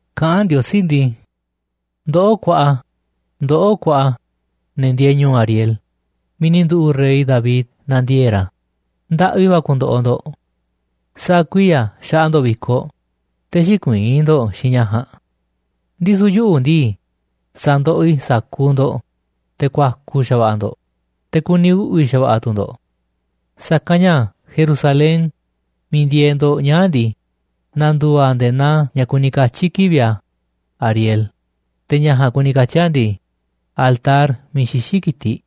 Kaꞌán Ndiosí ndii: “¡Ndoꞌó kuaꞌa, ndoꞌó kuaꞌa, ne̱ ndieeꞌ ñu̱u̱ Ariel miiꞌ ni̱ nduꞌu̱ꞌ rey David nandiee̱ꞌ ra̱! ¡Ndaꞌvi va̱ ku̱ndo̱ꞌo̱ ndo̱ꞌ! Sa̱a̱ kuiya̱ xaꞌa ndo̱ꞌ vi̱koꞌ, te̱ xïkuiín ndo̱ꞌ xiinꞌ ña̱ ja̱a̱nꞌ. Ndisu̱ yuꞌu̱ ndii, sa̱ndoꞌoꞌ i̱ sa̱kuuꞌ ndo̱ꞌ, te̱ ku̱a̱ku̱ xa̱va̱ꞌa̱ ndo̱ꞌ, te̱ ku̱ni̱ uꞌvi̱ xa̱va̱ꞌa̱ tu̱ ndo̱ꞌ. Sa̱kanꞌ ña̱ Jerusalén miiꞌ ndieeꞌ ndo̱ꞌ ñaa̱ꞌ ndii, na̱ndu̱u̱ a̱ nde̱e̱ naa ña̱ kuni katyi̱ kivi̱ꞌ a̱ Ariel. Te̱ ña̱ ja̱a̱nꞌ kuni katyi̱ a̱ ndii, altar miiꞌ xixí ki̱tiꞌ.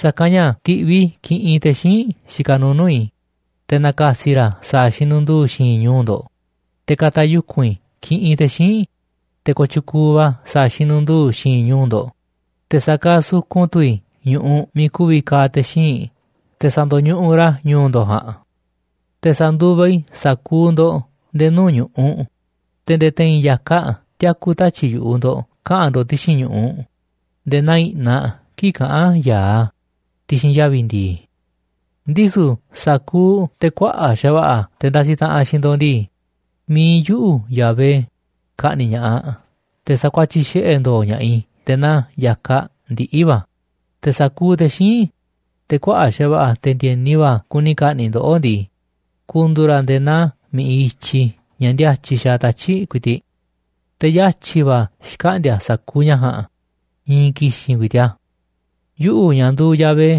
Sa̱kanꞌ ña̱ ti̱ꞌviꞌ i̱ kiꞌinꞌ te̱ xíinꞌ xikaꞌ nuuꞌ nuu̱ꞌ i̱, te̱ na̱ka̱si̱ ra̱ sa̱a̱ xinundu̱u̱ xi̱i̱nꞌ ñu̱u̱ ndo̱ꞌ. Te̱ ka̱ta̱ yuku̱n i̱ kiꞌinꞌ te̱ xíinꞌ, te̱ kooꞌ tyukuuꞌ va̱ sa̱a̱ xinundu̱u̱ xi̱i̱nꞌ ñu̱u̱ ndo̱ꞌ, te̱ sa̱kaaꞌ sukun tu̱ i̱ ñu̱ꞌuꞌ miiꞌ ku̱vi̱ ka̱a̱ te̱ xíinꞌ te̱ sa̱ndo̱ñuꞌuꞌ ra̱ ñu̱u̱ ndo̱ꞌ ja̱a̱nꞌ. Te̱ sa̱nduva i̱ sa̱kuuꞌ ndo̱ꞌ nde̱e̱ nuu̱ꞌ ñu̱ꞌuꞌ, te̱ nde̱e̱ te̱i̱n ya̱kaꞌ tiaku̱ tatyi̱ꞌ yu̱ꞌuꞌ ndo̱ꞌ kaꞌa̱n ndo̱ꞌ ti̱xi̱n ñu̱ꞌuꞌ nde̱e̱ naa i̱ꞌnaꞌ kii̱ꞌ kaꞌán ya̱aꞌ a̱ ti̱xi̱n yavi̱ ndi̱i̱. Ndisu̱ sa̱kuuꞌ te̱ kuaꞌa̱ꞌ xa̱va̱ꞌa̱, te̱ ndasiꞌ taꞌanꞌ xiinꞌ ndo̱ꞌ ndii, mi̱iꞌ yuꞌu̱, Yahvé, ka̱ꞌni̱ꞌ ña̱ꞌaꞌ te̱ sa̱kuatyiꞌ xiꞌe̱ ndo̱o̱ ña̱ꞌaꞌ i̱ nde̱e̱ naa ya̱kaꞌ ndiꞌi̱ va̱. Te̱ sa̱kuuꞌ te̱ xíinꞌ, te̱ kuaꞌa̱ꞌ xa̱va̱ꞌa̱, te̱ ndi̱e̱ni va̱ kuni ka̱ꞌni̱ꞌ ndoꞌó ndii, ku̱ndu̱u̱ ra̱ nde̱e̱ naa mi̱ꞌiꞌ i̱tyiꞌ ña̱ ndíátyiꞌ xaaꞌ tatyi̱ꞌ ku̱i̱ti̱ꞌ. Te̱ yatyi̱ va̱ xkaꞌndi̱a̱ sa̱kuuꞌ ña̱ ja̱a̱nꞌ, i̱i̱n ki̱xi̱n ku̱i̱ti̱ꞌ a̱. Yuꞌu̱, ña̱ nduuꞌ Yahvé,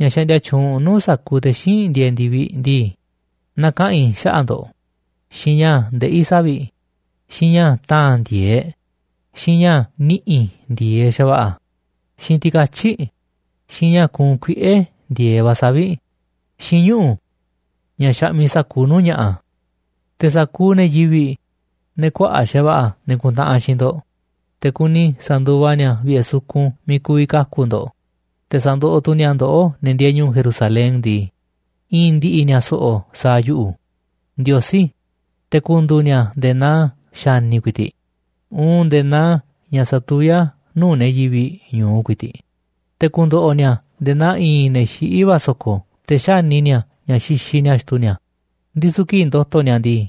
ña̱ xaꞌndia tyuunꞌ nuu̱ꞌ sa̱kuuꞌ te̱ xíinꞌ ndieeꞌ ndi̱viꞌ ndii, na̱kaꞌa̱n i̱ xaꞌa̱ꞌ ndo̱ꞌ xiinꞌ ña̱ ndeꞌí savi̱ꞌ, xiinꞌ ña̱ ta̱a̱n ndi̱e̱eꞌ, xiinꞌ ña̱ ni̱ꞌi̱ ndi̱e̱eꞌ xa̱va̱ꞌa̱, xiinꞌ ti̱katyi̱ꞌ, xiinꞌ ña̱ ku̱u̱nꞌ kuiꞌe̱ ndi̱e̱eꞌ va̱ savi̱ꞌ, xiinꞌ ñuꞌu̱ ña̱ xaꞌmiꞌ sa̱kuuꞌ nuu̱ꞌ ña̱ꞌa̱. Te̱ sa̱kuuꞌ ne̱ yivi̱ꞌ, ne̱ kuaꞌa̱ꞌ xa̱va̱ꞌa̱, ne̱ kuntaꞌanꞌ xiinꞌ ndo̱ꞌ, te̱ kuni sa̱nduva ni̱a̱ vi̱ꞌe̱ sukun miiꞌ ku̱vi̱ kaku̱ ndo̱ꞌ, te̱ sandoꞌoꞌ tu̱ ni̱a̱ ndoꞌó, ne̱ ndieeꞌ ñu̱u̱ Jerusalén ndii, i̱i̱n ndi̱ꞌi̱ ni̱a̱ so̱ꞌo̱ sa̱a̱ yuꞌu̱, Ndiosí, te̱ ku̱ndu̱u̱ ni̱a̱ nde̱e̱ naa xa̱ni̱ ku̱i̱ti̱ꞌ, uun nde̱e̱ naa ña̱ satuví a̱ nuu̱ꞌ ne̱ yivi̱ꞌ ñu̱u ku̱i̱ti̱ꞌ. Te̱ ku̱ndo̱ꞌo̱ ni̱a̱ nde̱e̱ naa i̱i̱n ne̱ xiꞌí va̱ so̱ko̱, te̱ xáni ni̱a̱ ña̱ xixiꞌ ni̱a̱ xtu ni̱a̱, ndisu̱ kii̱ꞌ ndo̱to̱ ni̱a̱ ndii,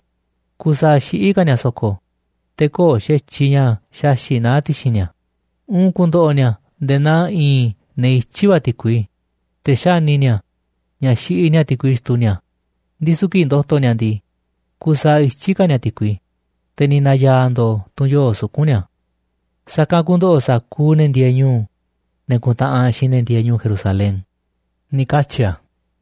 kusaaꞌ xiꞌí ka̱ ni̱a̱ so̱ko̱, te̱ köo̱ꞌ xa̱tyiꞌ ña̱ xaxi̱ꞌ naá xi̱ti̱ ni̱a̱. Uun ku̱ndo̱ꞌo̱ ni̱a̱ nde̱e̱ naa i̱i̱n ne̱ ityí va̱ ti̱kui, te̱ xáni ni̱a̱ ña̱ xiꞌiꞌ ni̱a̱ ti̱kui xtu ni̱a̱, ndisu̱ kii̱ꞌ ndo̱to̱ ni̱a̱ ndii, kusaaꞌ ityí ka̱ ni̱a̱ ti̱kui, te̱ ni̱ na̱ya̱a̱ ndo̱o̱ tunꞌ yoo̱ꞌ suku̱nꞌ ni̱a̱. Sa̱kanꞌ ku̱ndo̱ꞌo̱ sa̱kuuꞌ ne̱ ndieeꞌ ñu̱u̱, ne̱ kuntaꞌanꞌ xiinꞌ ne̱ ndieeꞌ ñu̱u̱ Jerusalén”, ni̱ katyi̱ a̱.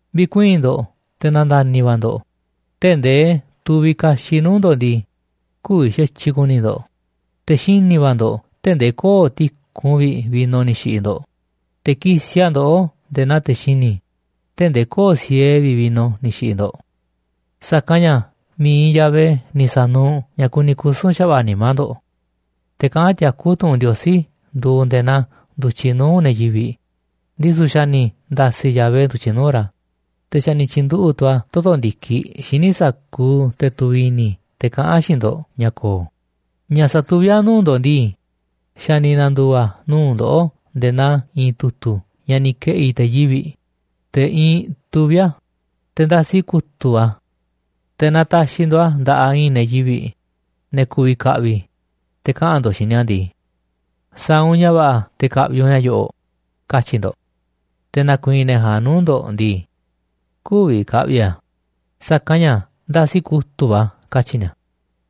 Vi̱kuii̱n ndo̱ꞌ, te̱ na̱nda̱ni̱ va̱ ndo̱ꞌ tee̱ꞌ ndee tuviꞌ kaxiꞌ nuu̱ꞌ ndo̱ꞌ ndii, kü̱vi̱ xa̱tyiꞌ ku̱ni̱ ndo̱ꞌ, te̱ xini̱ va̱ ndo̱ꞌ tee̱ꞌ ndee köo̱ꞌ tiku̱nꞌ vi̱ꞌ vino ni̱ xi̱ꞌi̱ ndo̱ꞌ, te̱ kisiꞌ a̱ ndoꞌó nde̱e̱ naa te̱ xini̱ tee̱ꞌ ndee köo̱ꞌ siee vi̱ꞌ vino ni̱ xi̱ꞌi̱ ndo̱ꞌ. Sa̱kanꞌ ña̱ mi̱iꞌ Yahvé ni̱ sa̱nuuꞌ ña̱ kuni kusu̱n xa̱va̱ꞌa̱ nimá ndo̱ꞌ. Te̱ kaꞌán tiakú tu̱ꞌu̱n Ndiosí nduuꞌ nde̱e̱ naa ndu̱tyiꞌ nuu̱ꞌ ne̱ yivi̱ꞌ, ndisu̱ xa̱ ni̱ nda̱si̱ Yahvé ndu̱tyiꞌ nuu̱ꞌ ra̱, te̱ xa̱ ni̱ tyi̱nduꞌu̱ꞌ tu̱ a̱ toto̱ ndi̱kiꞌ xíniꞌ sa̱kuuꞌ te̱ tuviꞌ i̱ni̱ te̱ kaꞌán xiinꞌ ndo̱ꞌ ña̱ ko̱o̱. Ña̱ satuví a̱ nuu̱ꞌ ndo̱ꞌ ndii, xa̱ ni̱ na̱ndu̱u̱ a̱ nuu̱ꞌ ndoꞌó nde̱e̱ naa i̱i̱n tu̱tu̱ ña̱ ni̱ ke̱ꞌi̱ te̱ yivi̱ꞌ, te̱ iinꞌ tuvíꞌ a̱, te̱ ndasi kutu̱ꞌ va̱ a̱. Te̱ naaꞌ ta̱xi̱ ndo̱ꞌ a̱ nda̱ꞌaꞌ i̱i̱n ne̱ yivi̱ꞌ, ne̱ ku̱vi̱ kaꞌviꞌ, te̱ kaꞌa̱n ndo̱ꞌ xiinꞌ ni̱a̱ ndii: “Sa̱a̱ u̱nꞌ ña̱ va̱ꞌa̱ te̱ ka̱ꞌvi̱ u̱nꞌ ña̱ yo̱ꞌo̱ꞌ”, katyi̱ ndo̱ꞌ. Te̱ na̱ku̱i̱i̱n ne̱ ja̱a̱nꞌ nuu̱ꞌ ndo̱ꞌ ndii: “Kü̱vi̱ ka̱ꞌvi̱ i̱ a̱, sa̱kanꞌ ña̱ ndasi kutu̱ꞌ va̱ a̱”, katyi̱ ni̱a̱.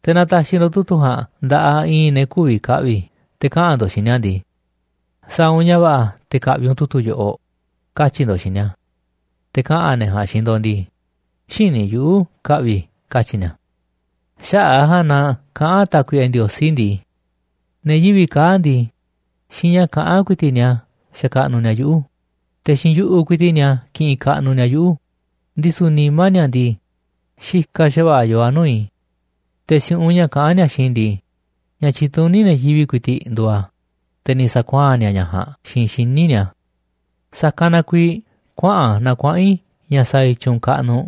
Te̱ naaꞌ ta̱xi̱ ndo̱ꞌ tu̱tu̱ ja̱a̱nꞌ nda̱ꞌaꞌ i̱i̱n ne̱ kü̱vi̱ ka̱ꞌvi̱, te̱ kaꞌa̱n ndo̱ꞌ xiinꞌ ni̱a̱ ndii: “Sa̱a̱ u̱nꞌ ña̱ va̱ꞌa̱ te̱ ka̱ꞌvi̱ u̱nꞌ tu̱tu̱ yoꞌoꞌ”, katyi̱ ndo̱ꞌ xiinꞌ ni̱a̱. Te̱ kaꞌa̱n ne̱ ja̱a̱nꞌ xiinꞌ ndo̱ꞌ ndii: “Xïní yuꞌu̱ ka̱ꞌvi̱ i̱”, katyi̱ ni̱a̱. Xaꞌa̱ꞌ a̱ ja̱a̱nꞌ na kaꞌán Tákuiꞌe Ndiosí ndii: “Ne̱ yivi̱ꞌ kaa̱ꞌ ndii, xiinꞌ ña̱ kaꞌán ku̱i̱ti̱ꞌ ni̱a̱ xakaꞌnuꞌ ni̱a̱ yuꞌu̱, te̱ xiinꞌ yu̱ꞌuꞌ ku̱i̱ti̱ꞌ ni̱a̱ kiꞌinꞌ kaꞌnuꞌ ni̱a̱ yuꞌu̱, ndisu̱ nimá ni̱a̱ ndii, xikaꞌ xa̱va̱ꞌa̱ yoo a̱ nuu̱ꞌ i̱. Te̱ si̱u̱ꞌunꞌ ña̱ kaꞌán ni̱a̱ xiinꞌ i̱ ndii, ña̱ tyituní ne̱ yivi̱ꞌ ku̱i̱ti̱ꞌ nduuꞌ a̱, te̱ ni̱ sa̱kuaa̱n ni̱a̱ ña̱ ja̱a̱nꞌ xiinꞌ xíniꞌ ni̱a̱ a̱. Sa̱kanꞌ na kuiiꞌ kuaꞌa̱n na kuaꞌa̱n i̱ ña̱ sa̱a̱ i̱ tyu̱u̱n kaꞌnuꞌ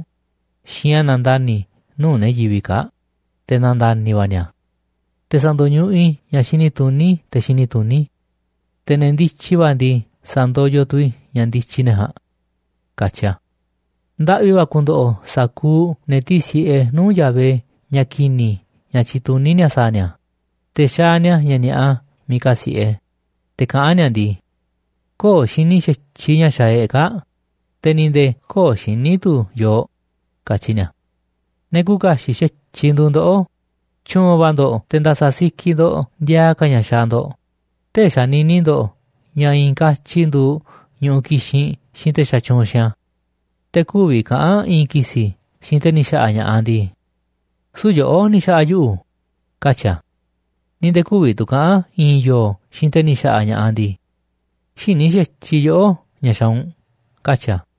xiinꞌ ña̱ nandani̱ nuu̱ꞌ ne̱ yivi̱ꞌ kaa̱ꞌ, te̱ na̱nda̱ni̱ va̱ ni̱a̱. Te̱ sa̱ndo̱ñuꞌuꞌ i̱ ña̱ xini tuní te̱ xini tuní, te̱ ne̱ ndityi va̱ ndii, sa̱ndoyoꞌ tu̱ i̱ ña̱ ndityi ne̱ ja̱a̱nꞌ”, katyi a̱. Ndaꞌvi va̱ ku̱ndo̱ꞌo̱ sa̱kuuꞌ ne̱ tísi̱ꞌe nuu̱ꞌ Yahvé ña̱ ki̱ni̱ ña̱ tyituní ni̱a̱ sa̱a̱ ni̱a̱, te̱ xaaꞌ ni̱a̱ ña̱ ni̱a̱ꞌa miiꞌ kasi̱ꞌe, te̱ kaꞌán ni̱a̱ ndii: “Köo̱ꞌ xini xa̱tyiꞌ ña̱ xaaꞌ e̱ꞌ kaa̱ꞌ, te̱ ni̱ nde̱e̱ köo̱ꞌ xiní tu̱ yooꞌ”, katyi ni̱a̱. Ne̱ küuꞌ kaxiꞌ xa̱tyiꞌ nduuꞌ ndoꞌó. Tyu̱u̱n va̱ ndo̱ꞌ te̱ nda̱sa̱ sikiꞌ ndo̱ꞌ ndiaa ka̱ ña̱ xaaꞌ ndo̱ꞌ tee̱ꞌ xanini ndo̱ꞌ ña̱ i̱i̱n katyi nduuꞌ ñu̱ꞌuꞌ kixinꞌ xiinꞌ te̱ xatyuunꞌ xiinꞌ a̱. Te̱ kü̱vi̱ kaꞌa̱n i̱i̱n ki̱si̱ xiinꞌ te̱ ni̱ xa̱ꞌa̱ ña̱ꞌaꞌ ndii: “Süu̱ꞌ yoꞌó ni̱ xa̱ꞌa̱ yuꞌu̱”, katyi̱ a̱. Ni̱ nde̱e̱ kü̱vi̱ tu̱ kaꞌa̱n i̱i̱n yo̱o̱ xiinꞌ te̱ ni̱ xa̱ꞌa̱ ña̱ꞌaꞌ ndii: “Xïní xa̱tyiꞌ yoꞌó ña̱ xaaꞌ u̱nꞌ”, katyi̱ a̱.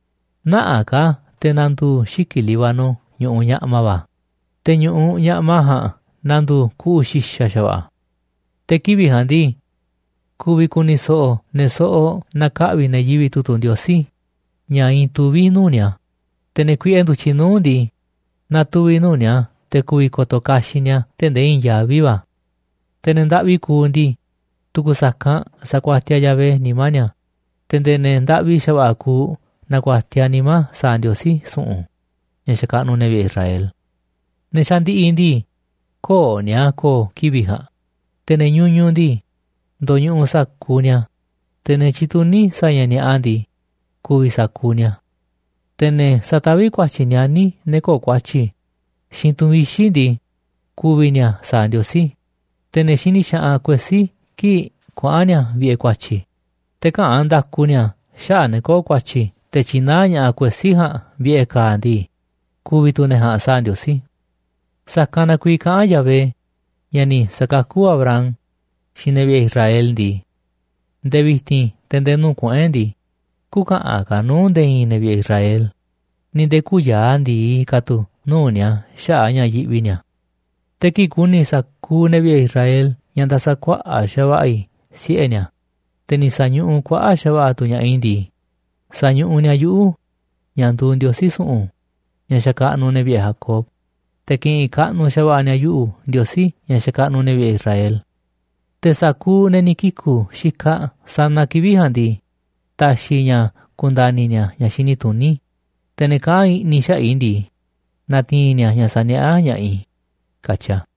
Nä̱ꞌaꞌ ka̱ te̱ na̱ndu̱u̱ xiki̱ꞌ Líbano ñu̱ꞌuꞌ ñaꞌma va̱, te̱ ñu̱ꞌuꞌ ñaꞌma ja̱a̱nꞌ na̱ndu̱u̱ kuꞌu̱ xi̱xa̱ xa̱va̱ꞌa̱. Te̱ kivi̱ꞌ ja̱a̱nꞌ ndii, ku̱vi̱ ku̱ni̱ so̱ꞌo̱ ne̱ soꞌoꞌ naaꞌ ka̱ꞌvi̱ ne̱ yivi̱ꞌ tu̱tu̱ Ndiosí ña̱ iinꞌ tuvíꞌ nuu̱ꞌ ni̱a̱, te̱ ne̱ kuiꞌe ndu̱tyiꞌ nuu̱ꞌ ndii, na̱tuvi̱ nuu̱ꞌ ni̱a̱ te̱ ku̱vi̱ ko̱to̱ kaxiꞌ ni̱a̱ tee̱ꞌ ndee i̱i̱n yaví va̱. Te̱ ne̱ ndaꞌvi kuuꞌ ndii, tu̱ku̱ sa̱kanꞌ sa̱kuatiaꞌ Yahvé nimá ni̱a̱, te̱ nde̱e̱ ne̱ ndaꞌvi xa̱va̱ꞌa̱ kuuꞌ na̱ku̱a̱tiaꞌ nimá sa̱a̱ Ndiosí su̱ꞌu̱n ña̱ xakaꞌnuꞌ ne̱ vi̱ꞌe̱ Israel. Ne̱ xandiꞌiꞌ ndii, köo̱ꞌ ni̱a̱ ko̱o̱ kivi̱ꞌ ja̱a̱nꞌ, te̱ ne̱ ñuñuꞌ ndii, ndoñuꞌuꞌ sa̱kuuꞌ ni̱a̱, te̱ ne̱ tyituní sa̱a̱ ña̱ ni̱a̱ꞌa ndii, ku̱vi̱ sa̱kuuꞌ ni̱a̱. Te̱ ne̱ sataví ku̱a̱tyi̱ nianí ne̱ köo̱ꞌ ku̱a̱tyi̱ xiinꞌ tu̱n vixi̱ ndii, ku̱vi̱ ni̱a̱ sa̱a̱ Ndiosí. Te̱ ne̱ xini xaꞌanꞌ kuesí kii̱ꞌ kuaꞌa̱n ni̱a̱ vi̱ꞌe̱ ku̱a̱tyi̱, te̱ käꞌán nda̱ku ni̱a̱ xaꞌa̱ꞌ ne̱ köo̱ꞌ ku̱a̱tyi̱ te̱ tyinaá ña̱ꞌaꞌ kuesí ja̱a̱nꞌ vi̱ꞌe̱ ka̱a̱ ndii, ku̱vi̱ tu̱ ne̱ ja̱a̱nꞌ sa̱a̱ Ndiosí. Sa̱kanꞌ na kuiiꞌ kaꞌán Yahvé, ña̱ ni̱ sa̱kakú Abraham, xiinꞌ ne̱ vi̱ꞌe̱ Israel ndii: “Nde̱e̱ vi̱ti̱n te̱ nde̱e̱ nuu̱ꞌ kuꞌu̱n e̱ꞌ ndii, kü̱ka̱ꞌa̱n ka̱ nuu̱ꞌ nde̱e̱ i̱i̱n ne̱ vi̱ꞌe̱ Israel ni̱ nde̱e̱ kü̱ya̱a̱ ndi̱i ka̱ tu̱ nuu̱ꞌ ni̱a̱ xaꞌa̱ꞌ ña̱ yiꞌvi ni̱a̱. Te̱ kii̱ꞌ ku̱ni̱ sa̱kuuꞌ ne̱ vi̱ꞌe̱ Israel ña̱ nda̱sa̱ kuaꞌa̱ꞌ xa̱va̱ꞌa̱ i̱ siꞌe̱ ni̱a̱, te̱ ni̱ sa̱ñuꞌuꞌ kuaꞌa̱ꞌ xa̱va̱ꞌa̱ tu̱ ña̱ꞌaꞌ i̱ ndii, sa̱ñuꞌuꞌ ni̱a̱ yuꞌu̱, ña̱ nduuꞌ Ndiosí su̱ꞌu̱n, ña̱ xakaꞌnuꞌ ne̱ vi̱ꞌe̱ Jacob, te̱ ki̱ꞌi̱n kaꞌnuꞌ xa̱va̱ꞌa̱ ni̱a̱ yuꞌu̱, Ndiosí, ña̱ xakaꞌnuꞌ ne̱ vi̱ꞌe̱ Israel. Te̱ sa̱kuuꞌ ne̱ ni̱ kiku̱ xikaꞌ sanaꞌ kivi̱ꞌ ja̱a̱nꞌ ndii, ta̱xi̱ i̱ ña̱ ku̱nda̱ni̱ ni̱a̱ ña̱ xini tuní, te̱ ne̱ kaꞌán i̱ꞌni̱ xaꞌa̱ꞌ i̱ ndii, na̱ti̱i̱n ni̱a̱ ña̱ saniaꞌá ña̱ꞌaꞌ i̱”, katyi a̱.